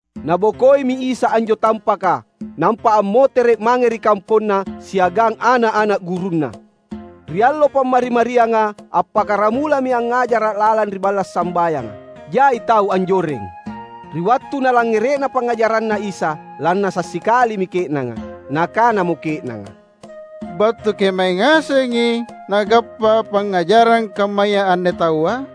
Nabokoimi Isa anjo tampaka, nampa ammotere’ mange ri kamponNa siagang ana’-ana’ gurunNa. Ri allo Pammari-marianga, appakkaramulami angngajara’ lalang ri balla’ sambayanga. Jai tau anjoreng. Ri wattu nalangngere’na pangngajaranNa Isa, lannasa’ sikalimi ke’nanga. Nakanamo ke’nanga, "Battu kemae ngasengi nagappa pangngajarang kammaya anne taua?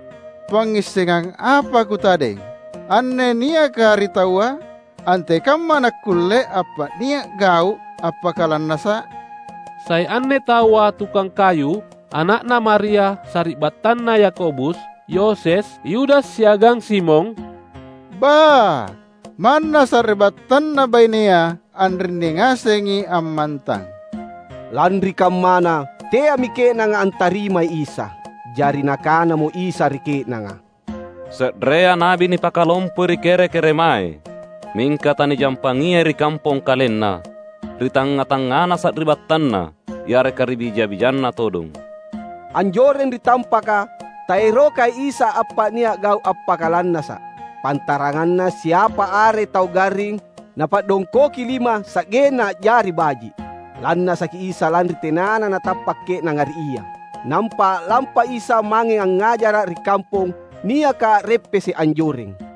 Pangngissengang apa kutadeng, anne niaka ri taua? Antekamma nakkulle appa’nia’ gau’ appakalannasa’? Sai anne taua tukang kayu, ana’na Maria, sari’battanna Yakobus, Yoses, Yudas, siagang Simon? Ba, manna sari’battanNa bainea anrinni ngasengi ammantang." Lanri kammana, teami ke’nanga antarimai Isa. Jari Nakanamo Isa ri ke’nanga, "Se’rea na’bi nipakalompoi ri kere-keremae. Mingka tanijampangiai ri kampong kalenna, ri tangnga-tangngana sari’battanna, yareka ri bija-bijanna todong." Anjoreng ri tampaka taerokai Isa appa’nia’ gau’ appakalannasa’, pantaranganna siapa are tau garring Napadongkoki lima sa’genna a’jari baji’. Lannasaki Isa lanri tenana natappa’ ke’nanga ri Ia. Nampa a’lampa Isa mange angngajara’ ri kampong niaka a’reppese’ anjoreng.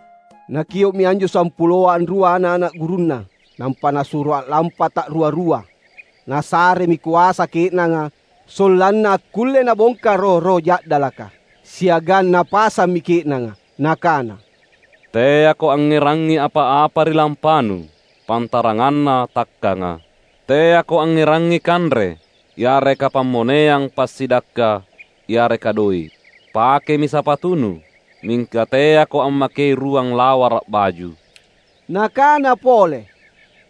Nakio’mi anjo sampuloa anrua ana’-ana’ gurunNa. Nampa Nasuro a’lampa ta’rua-rua. Nasaremi koasa ke’nanga sollanna akkulle nabongka roh-roh ja’dalaka. Siagang Napasammi ke’nanga Nakana, "Teako angngerangi apa-apa ri lampanu, pantaranganna takkanga. Teako angngerangi kanre, yareka pammoneang passidakka, yareka doe’. Pakemi sapatunu, mingka teako ammakei ruang lawara’ baju." Nakana pole,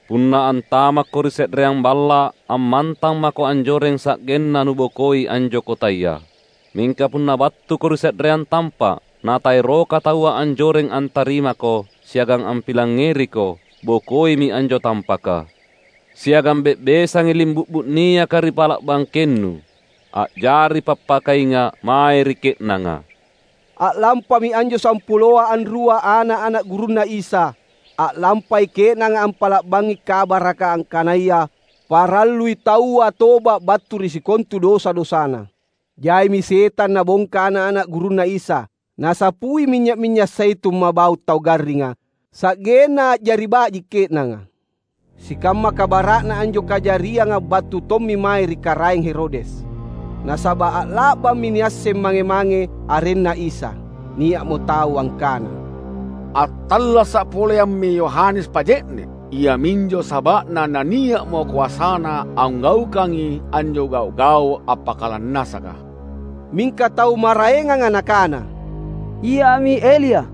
"Punna antamakko ri se’reang balla’ ammantang mako anjoreng sa’genna nubokoi anjo kotaya. Mingka punna battuko ri se’reang tampa’, na taeroka taua anjoreng antarimako siagang ampilangngeriko, bokoimi anjo tampaka. Siagang be’besangi limbu’bu niaka ri pala’ bangkennu, a’jari pappakainga’ mae ri ke’nanga!" A’lampami anjo sampuloa anrua ana’-ana’ gurunNa Isa. A’lampai ke’nanga ampa’la’bangi kabaraka angkanaya parallui taua toba’ battu ri sikontu dosa-dosana. Jaimi setang nabongka ana’-ana’ gurunNa Isa, nasapui minynya’-minynya’ zaitun mabau’ tau garringa sa’genna a’jari baji’ ke’nanga. Sikamma kabara’na anjo kajarianga battu tommi mae ri Karaeng Herodes. Nasaba’ a’la’bammi niasseng mange-mange arenNa Isa. Nia’mo tau angkana, "Attallasa’ poleammi Yohanes Paje’ne’! Iaminjo saba’na na nia’mo koasana anggaukangi anjo gau’-gau’ appakalannasaka." Mingka tau maraenganga nakana, "Iami Elia."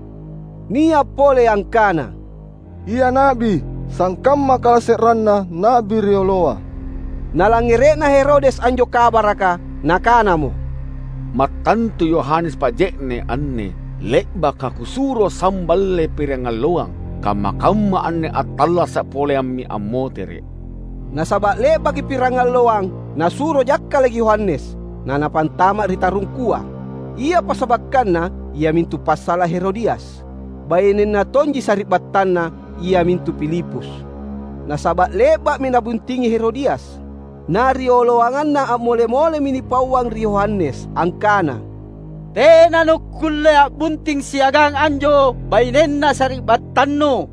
Nia’ pole angkana, "Ia na’bi, sangkamma kalase’renna na’bi rioloa." Nalangngere’na Herodes anjo kabaraka, nakanamo, "Mattantu Yohanes Paje’ne’ anne, le’baka kusuro samballe pirangalloang. Kamma-kamma anne attallasa’ poleammi ammotere’!" Nasaba’ le’baki pirangalloang nasuro jakkala’ Yohanes, na napantama’ ri tarungkua. Ia passabakkanna iamintu passala’ Herodias, bainenna tonji sari’battanna, iamintu Filipus. Nasaba’ le’ba’mi nabuntingi Herodias, na rioloanganna a’mole-molemi nipauang ri Yohanes angkana, "Tena nukkulle a’bunting siagang anjo bainenna sari’battannu!"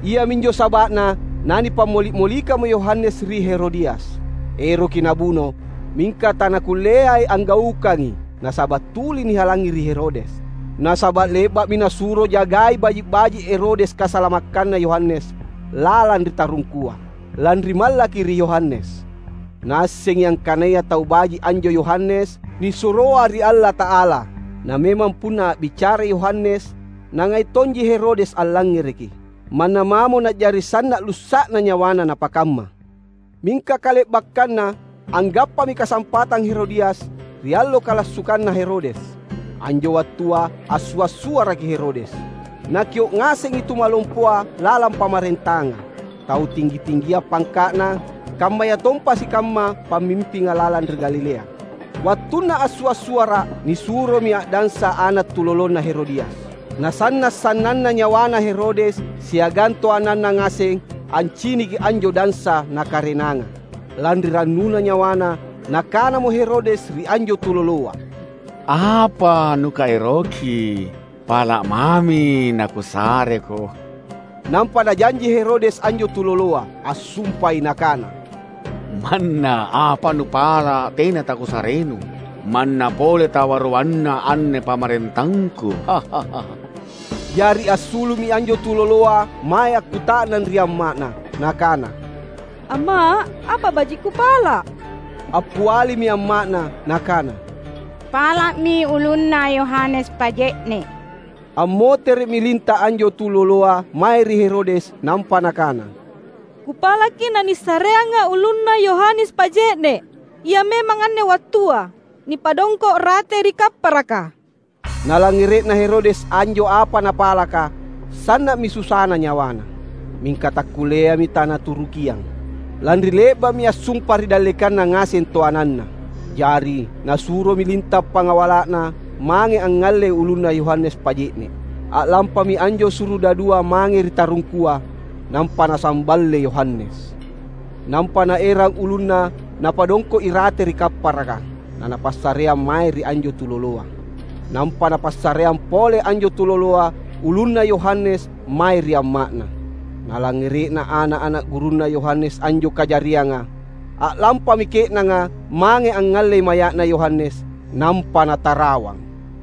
Iaminjo saba’na nanipammoli’-molikammo Yohanes ri Herodias. Eroki nabuno, mingka tanakulleai anggaukangi nasaba’ tuli nihalangi ri Herodes. Nasaba’ le’ba’mi nasuro jagai baji’-baji’ Herodes kasalamakkanna Yohanes lalang ri tarungkua, lanri mallaki ri Yohanes. Naassengi angkanaya tau baji’ anjo Yohanes, nisuroa ri Allata’ala. Na memang, punna a’bicara Yohanes, nangai tonji Herodes allangngereki, manna mamo na’jari sanna’ lussa’na nyawana napakamma. Mingka kale’bakkanna, anggappami kasampatang Herodias ri allo kalassukanna Herodes. Anjo wattua assua’-suaraki Herodes. Nakio’ ngasengi tumalompoa lalang pamarentanga, tau tinggi-tinggia pangka’na, kammayatompa sikamma pamimpinga lalang ri Galilea. Wattunna assua’-suara’ nisuromi a’dansa ana’ tulolona Herodias. Nasanna’ sannanna nyawana Herodes siagang toananna ngaseng anciniki anjo dansa nakarenanga. Lanri rannuna nyawana, nakanamo Herodes ri anjo tuloloa, "Apa nukaeroki, pala’mami nakusareko." Nampa najanji Herodes anjo tuloloa. Assumpai nakana, "Manna apa nupala’ tena takusarenu, manna pole tawaruanna anne pamarentangku!" Jari assulu’mi anjo tuloloa mae akkuta’nang ri amma’na nakana, "Amma’, apa baji’ kupala’?" Appialimi amma’na nakana, "Pala’mi ulunna Yohanes Paje’ne’." Ammotere’mi linta’ anjo tuloloa mae ri Herodes nampa nakana, "Kupalaki na nisareanga’ ulunna Yohanes Paje’ne’. Ia memang anne wattua, nipadongko’ rate ri kapparaka!" Nalangngere’na Herodes anjo apa napalaka, sanna’mi susana nyawana. Mingka takkulleami tanaturukiang, lanri le’ba’mi assumpa ri dallekanna ngaseng toananna. Jari nasuromi linta’ pangawala’na mange angngallei ulunna Yohanes Paje’ne’. A’lampami anjo surudadua mange ri tarungkua, nampa nasamballe Yohanes. Nampa naerang ulunna napadongko’ irate ri kapparaka, na napassareang mae ri anjo tuloloa. Nampa napassareang pole anjo tuloloa ulunna Yohanes mae ri amma’na. Nalangngere’na ana’-ana’ gurunna Yohanes anjo kajarianga, a’lampami ke’nanga mange angngallei maya’na Yohanes, nampa natarawang.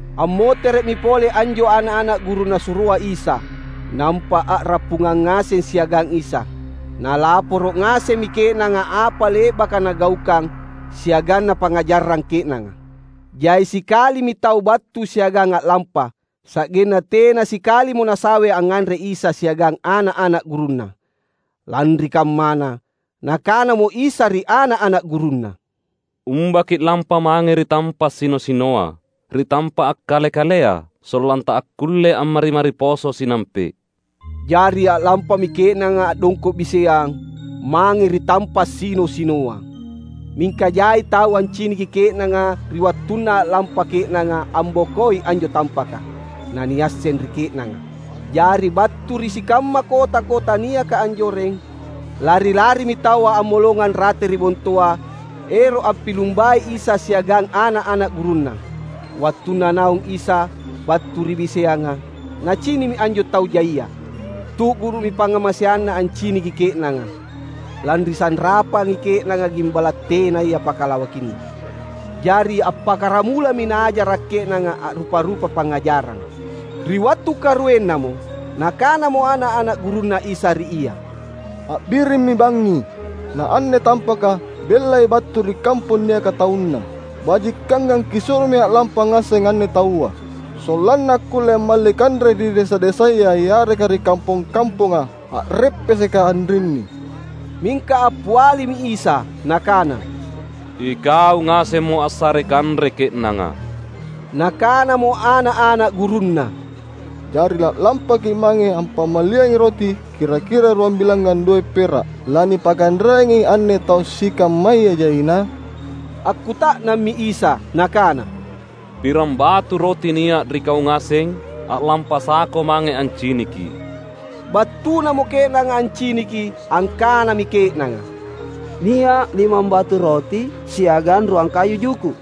Ammotere’mi pole anjo ana’-ana’ guru Nasuroa Isa, nampa a’rappungang ngaseng siagang Isa. Nalaporo’ ngasemmi ke’nanga apa le’baka nagaukang siagang napangngajarang ke’nanga. Jai sikalimi tau battu siagang a’lampa, sa’genna tena sikalimo nasawe angnganre Isa siagang ana’-ana’ gurunNa. Lanri kammana, Nakanamo Isa ri ana’-ana’ gurunNa, "Umba ki’lampa mange ri tampa’ sino-sinoa, ri tampa’ akkale-kalea, sollanta akkulle ammari-mari poso sinampe’." Jari a’lampami ke’nanga a’dongko’ biseang, mange ri tampa’ sino-sinoa. Mingka jai tau anciniki ke’nanga ri wattunna a’lampa ke’nanga ambokoi anjo tampaka, na niasseng ri ke’nanga. Jari battu ri sikamma kota-kota niaka anjoreng, lari-larimi taua ammolongang rate ri bontoa ero’ ampilumbai Isa siagang ana’-ana’ gurunNa. Wattunna naung Isa battu ri biseanga, Nacini’mi anjo tau jaia. Tu’guru’mi pangngamaseanNa anciniki ke’nanga, lanri sanrapangi ke’nanga gimbala’ tenaya pakalawakinna. Jari appakkaramulami Naajara’ ke’nanga a’rupa-rupa pangngajarang. Ri wattu karuennamo Nakanamo ana’-ana’ gurunNa Isa ri Ia, "A’birimmi bangngi, na anne tampaka bellai battu ri kampong niaka taunna. Bajikangang Kisuromi a’lampa ngaseng anne taua, sollanna akkulle ammalli kanre ri desa-desaya yareka ri kampong-kamponga, a’reppeseka anrinni." Mingka appialimi Isa Nakana, "Ikau ngasemmo assarei kanre ke’nanga." Nakanamo ana’-ana’ gurunNa, "Jari la’lampaki’ mange ampammalliangi roti kira-kira ruambilangngang doe’ pera’, lanipakanreangi anne tau sikammaya jaina?" Akkuta’nammi Isa Nakana, "Piram batu roti nia’ ri kau ngaseng? A’lampasako mange anciniki!" Battunamo ke’nanga anciniki, angkanami ke’nanga, "Nia’ limambatu roti siagang ruang kayu juku’."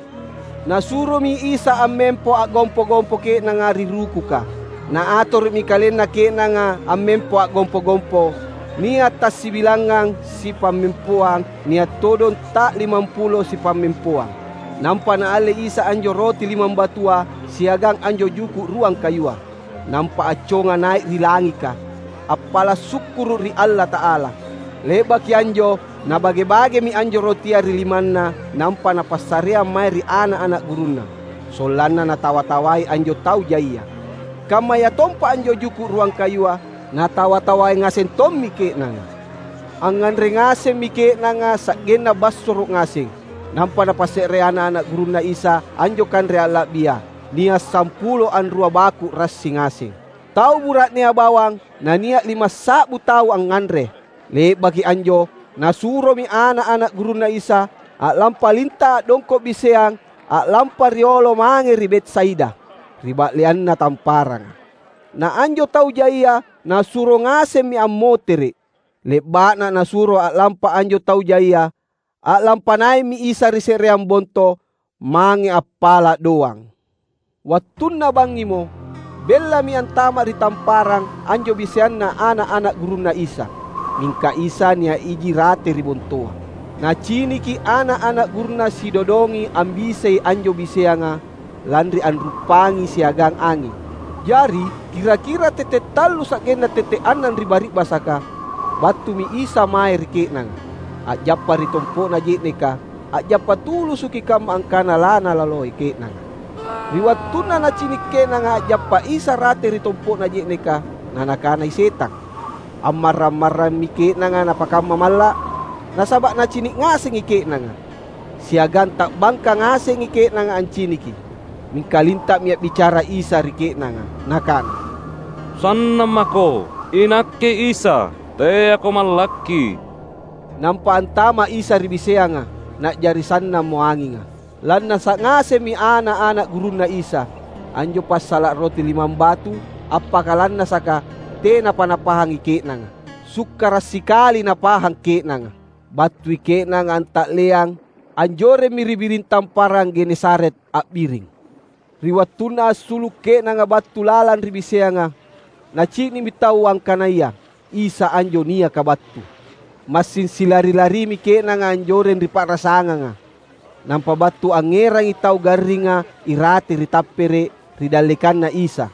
Nasuromi Isa ammempo a’gompo-gompo ke’nanga, ri rukuka. Na atoro’mi kalenna ke’nanga ammempo a’gompo-gompo. Nia’ tassibilangngang sipammempoang, nia’ todong ta’limampulo sipammempoang. Nampa Naalle Isa anjo roti limambatua siagang anjo juku’ ruang kayua; nampa acconga nai’ ri langika, appala’ sukkuru’ ri Allata’ala. Le’baki anjo Nabage-bagemi anjo rotia ri limanNa nampa Napassareang mae ri ana’-ana’ gurunNa, sollanna natawa-tawai anjo tau jaia. Kammayatompa anjo juku’ ruang kayua, natawa-tawai ngaseng tommi ke’nanga. Angnganre ngasemmi ke’nanga sa’genna bassoro’ ngaseng. Nampa napasse’re ana’-ana’ gurunNa Isa anjo kanre alla’bia — nia’ sampulo anrua baku’ rassi ngaseng. Tau bura’nea bawang na nia’ limassa’bu tau angnganre. Le’baki anjo Nasuromi ana’-ana’ gurunNa Isa a’lampa linta’ a’dongko’ biseang a’lampa riolo mange ri Betsaida, ri ba’leanna tamparanga. Na anjo tau jaia Nasuro ngasemmi ammotere’. Le’ba’na Nasuro a’lampa anjo tau jaia, a’lampa nai’mi Isa ri se’reang bonto, mange appala’ doang. Wattunna bangngimo, bellami antama’ ri tamparang anjo biseanna ana’-ana’ gurunNa Isa. Mingka Isa nia’ iji rate ri bontoa. Naciniki ana’-ana’ gurunNa sidodongi ambisei anjo biseanga lanri a’ruppangi siagang anging. Jari kira-kira tette’ tallu sa’genna tette’ annang ri bari’basaka, battumi Isa mae ri ke’nanga, a’jappa ri tompo’na je’neka. A’jappa tulusuki kamma angkana lanalaloi ke’nanga. Ri wattunna nacini’ ke’nanga a’jappa Isa rate ri tompo’na je’neka na nakanai setang, ammarrang-marrammi ke’nanga napakamma malla’. Nasaba’ nacini’ ngasengi ke’nanga, siagang ta’bangka ngasengi ke’nanga anciniki. Mingka linta’mi a’bicara Isa ri ke’nanga Nakana, "Sannammako! INakke Isa. Teako mallakki!" Nampa antama’ Isa ri biseanga, na’jari sannammo anginga. Lannasa’ ngasemmi ana’-ana’ gurunNa Isa. Anjo passala’ roti limambatu appakalannasaka tenapa napahangi ke’nanga. Sukkara’ sikali napahang ke’nanga. Battui ke’nanga anta’leang, anjoremmi ri biring Tamparang Genesaret a’biring. Ri wattunna assulu’ ke’nanga battu lalang ri biseanga, nacini’mi taua angkanaya Isa anjo niaka battu. Massing silari-larimi ke’nanga anjoreng ri pa’rasanganga, nampa battu angngerangi tau garringa irate ri tappere’, ri dallekanNa Isa.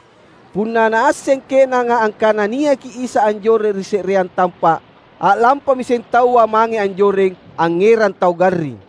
Punna naasseng ke’nanga angkana niaki Isa anjoreng ri se’reang tampa’, a’lampamiseng taua mange anjoreng angngerang tau garring.